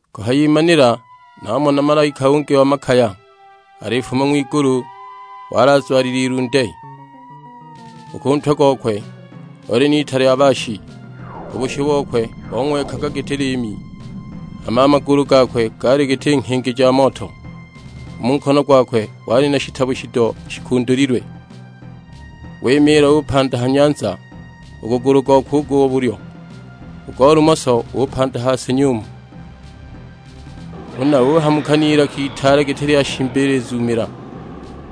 Kuhayimanila namona malaika ungi wa makaya alifuma ng'wigulu; wali azwalile ilunde, u ku ntwe gokwe oli n'ita lya baashi. U bushu bokwe bong'wekaga giti liimi, hama a magulu gakwe gaali giti nghingi ja moto. U mu nkono gwakwe wali na shitabo shido shikundulilwe. Wimiila upanda ha nyanza u gugulu gokwe u go bulyo, u go lumoso upanda ha si nyumu. Huna uhamuka n'ilaka itaale giti lya shimba ilizuumiila;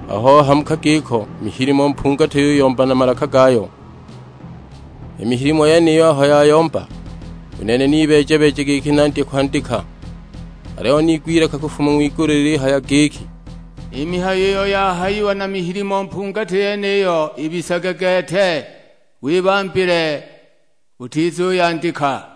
aho ohamuka giko mihilimo mpungati yuyomba na malaka gayo. I mihilimo yeniyo aho yayomba, u nene nibeeja-beeja giki nandye kwandika; aliyo niigwa ilaka kufuma ng'wigulu lilihaya giki, "I mihayo iyo yahayiwa na mihilimo mpungati yeniyo ibisage gete, wibambile, utizuyandika!"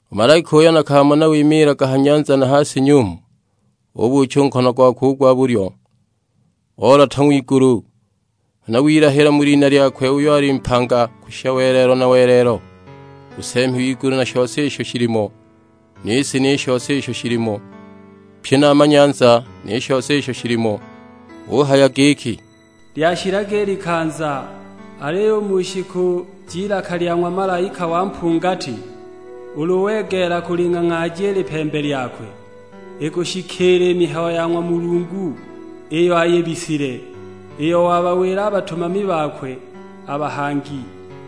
U malaika uyo nakamona wimiilaga ha nyanza na ha si nyumu ubuucha u nkono gokwe u gwa bulyo, oolota ng'wigulu. Huna wilahila mu lina lyakwe uyo ali mpanga kushisha welelo na welelo; u nseemi w'igulu na shose isho shilimo, ni si ni shose isho shilimo, pye na a manyanza ni shose isho shilimo; uhaya giki, "Lyashilaga i likanza. Aliyo u mu shiku j'ilaka lya ng'wa malaika wa mpungati, ulu wegeela kuling'ang'aaja i lipembe lyakwe, ikushikiila i mihayo ya ng'wa Mulungu iyo ayibisile, iyo wabawila a batumami bakwe a bahangi."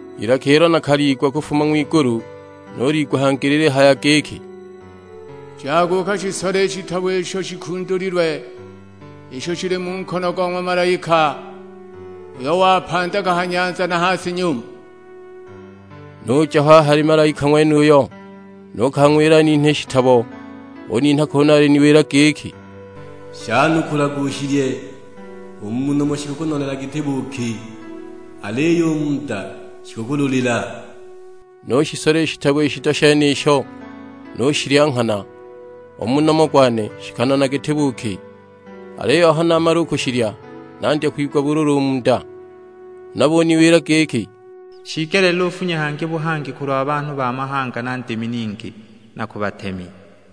I lilaka ilo nakaliigwa kufuma ng'wigulu nuliigwa hangi lilihaya giki, "Jaga ukashisole i shitabo isho shikundulilwe, isho shili mu nkono go ng'wa malaika, uyo wapandaga ha nyanza na ha si nyumu." Nuja ho a hali malaika ng'wenuyo, nukang'wila aninhe i shitabo. Uninha kunu aliniwila giki, "Shanukulage ushilye; u mu nomo shikukunonela giti buuki, aliyo u mu nda shikukululila." Nushisola i shitabo i shido shenisho nushilya nghana, u mu nomo gwane shikanona giti buuki, aliyo aho namala u kushilya nandya kwigwa bululu u mu nda. Huna buniwila giki, "Shiigelile ufunye hangi buhangi kulwa banhu ba mahanga na ndimi ningi, na ku batemi."